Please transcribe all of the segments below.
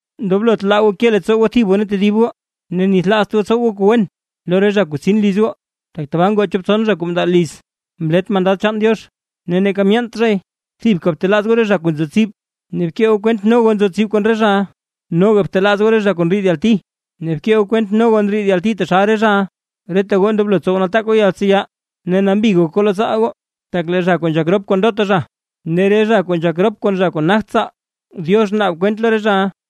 Ndoblot laa goo ke leettsoo goo thib goo ne tedib goo. Ne nithlaazt goo tsow goo kuu wen lo re zha kuu tsin liz goo, tak tabaa ngoo chop tson zha kuu mndaa liz mlet mandad chaan Diox ne neeka myeent zhay. Thibka btelaaz goo re zha kuu nzo tsib, ne bkee goo kwent no goo nzo tsib kon re zhaʼa. Noga btelaaz goo re zha kuu ndriid yalti, ne bkee goo kwent no goo ndriid yalti taxal re zhaʼa. Reta goo ndoblo tsow nataak goo yaltseya, ne nambi gok goo lo tsaal goo; tak lee re zha kuu nzhak rop kon ndota zha, ne re zha kuu nzhak rop kon zha kuu nagt tsaal, Diox naab kwent lo re zhaʼa.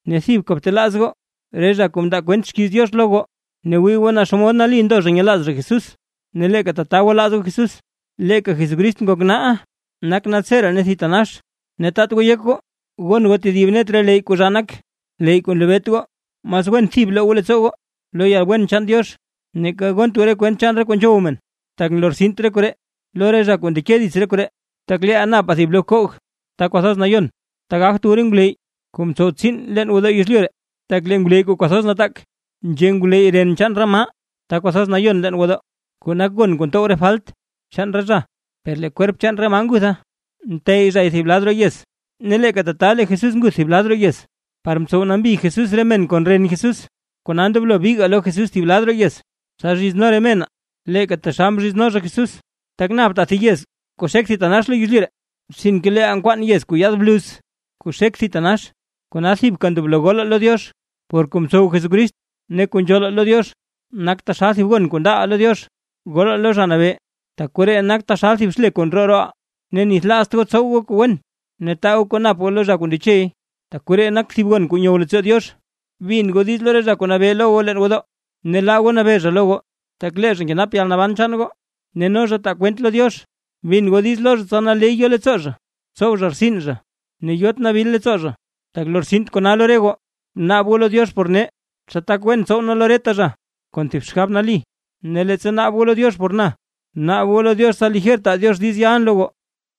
Ne thibka btelaaz goo re zha kuu mndaa kwent xkiiz Diox lo goo; ne wii goo naa xomod nali ndo zha nyelaaz zha Jesús ne leeka tata gwalaaz goo Jesús. Leeka Jesucrist nak naaʼa, nak naltseree ne thitanax. Ne taat goo yek goo gon goo tedib net re leyy kuu zhaa nak, leyy kuu nlebeet goo. Mas wen thib bloo goo leettsoo goo lo yalwen chaan Diox, neeka gont goo re kwent chaan re kuu nzhow men; tak nlortsint re koree lo re zha kuu ndeke dits re koree. Tak leeʼaa napaa thib lo bkoog Ta Kwathoz Nayon, ta gagt wu re ngwleyy kuu mtsow tsiin leen gwodoo yezlyu ree. Tak lee ngwleyy kuu kwathoz nataak, nzhe ngwleyy ren chaan re maa Ta Kwathoz Nayon leen gwodoo, kuu nak gon kuu ntow re falt chaan re zha, per lee kwerp chaan re maa ngutha nteyy zha thib lad roo yez. Ne leeka tata lee Jesús nguth thib lad roo yez, par mtsow nambi Jesús re men kon ren Jesús. Kona ndoblo bigaa lo Jesús thib lad roo yez, tsa zhizno re menaa leeka taxal mzhizno zha Jesús. Tak naptaa thib yez kuu xek thitanax lo yezlyu ree, sinke leeʼaa nkwaanaa yez kuu yaad bluz kuu xek thitanax. Kona thibka ndoblo golaa lo Diox por kuu mtsow Jesucrist, ne kuu nzhoolaa lo Diox nak taxal thib gon kuu ndaaʼaa lo Diox. Golaa lo Zha Nabee, tak koree nak taxal thib xle kuu ndroo rooʼaa. Ne nithlaazt goo tsow goo kuu wen, ne taa goo kuu nap goo lo zha kuu ndechey, tak koree nak thib gon kuu nyow leettsoo Diox. Bin goo diiz lo re zha kuu nabee lo goo leen gwodoo, ne laa goo nabee zha lo goo, tak lee zha nkenap yalnaban chaan goo ne no zha taa kwent lo Diox. Bin goo diiz lo zha tsa naley yo leettsoo zha tsow zha rtsin zha, ne yot nabil leettsoo zha, tak lortsint kona lo re goo. Bnaab goo lo Diox por nee, tsa tak wen tsow nee lo reta zha, kon thib xgab nali. Ne leettsa naab goo lo Diox por na, naab goo lo Diox tsa lijer taa Diox diiz yalʼn lo goo.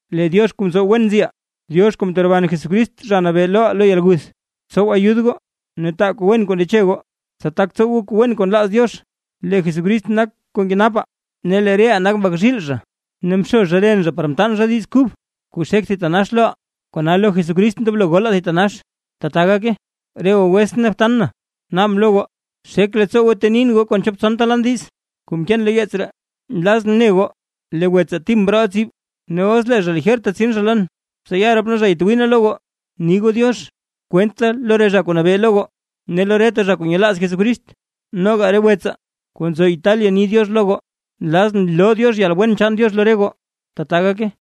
Lee Diox kuu ntsow wen nziʼaa, Diox kuu mteroban Jesucrist Zha Nabee loʼaa lo yalguth, tsow ayud goo ne taa kuu wen kuu ndeche goo, tsa tak tsow goo kuu wen kuu nlaaz Diox. Lee Jesucrist nak kuu nkenapaa ne lee reʼaa nak mbak zhiil zha, ne mxo zha ren zha par mtaan zha Diiz Kub kuu xek thitanax loʼaa. Kona lo Jesucrist ndoblo golaa thitanax. ¡Tata gake! Re goo wetsʼn ne btan na, naabʼn lo goo xek leettsoo goo ntenin goo kon chop tson lan diiz kuu mkeen lo yeets ree. Nlazʼn ne goo, lee wetsaa Tim mrooʼa tsib, ne os lee zha lijerta tsin zha lon, tsa ya rop nee zha yatwii nee lo goo. Bni goo “diox” kwent da lo re zha kuu nabee lo goo, ne lo reta zha kuu nyelaaz Jesucrist. Noga re wetsaa kuu nzo Italia ni “diox” lo goo. Nlazʼn loo Diox yalwen chaan Diox lo re goo. Tata gake.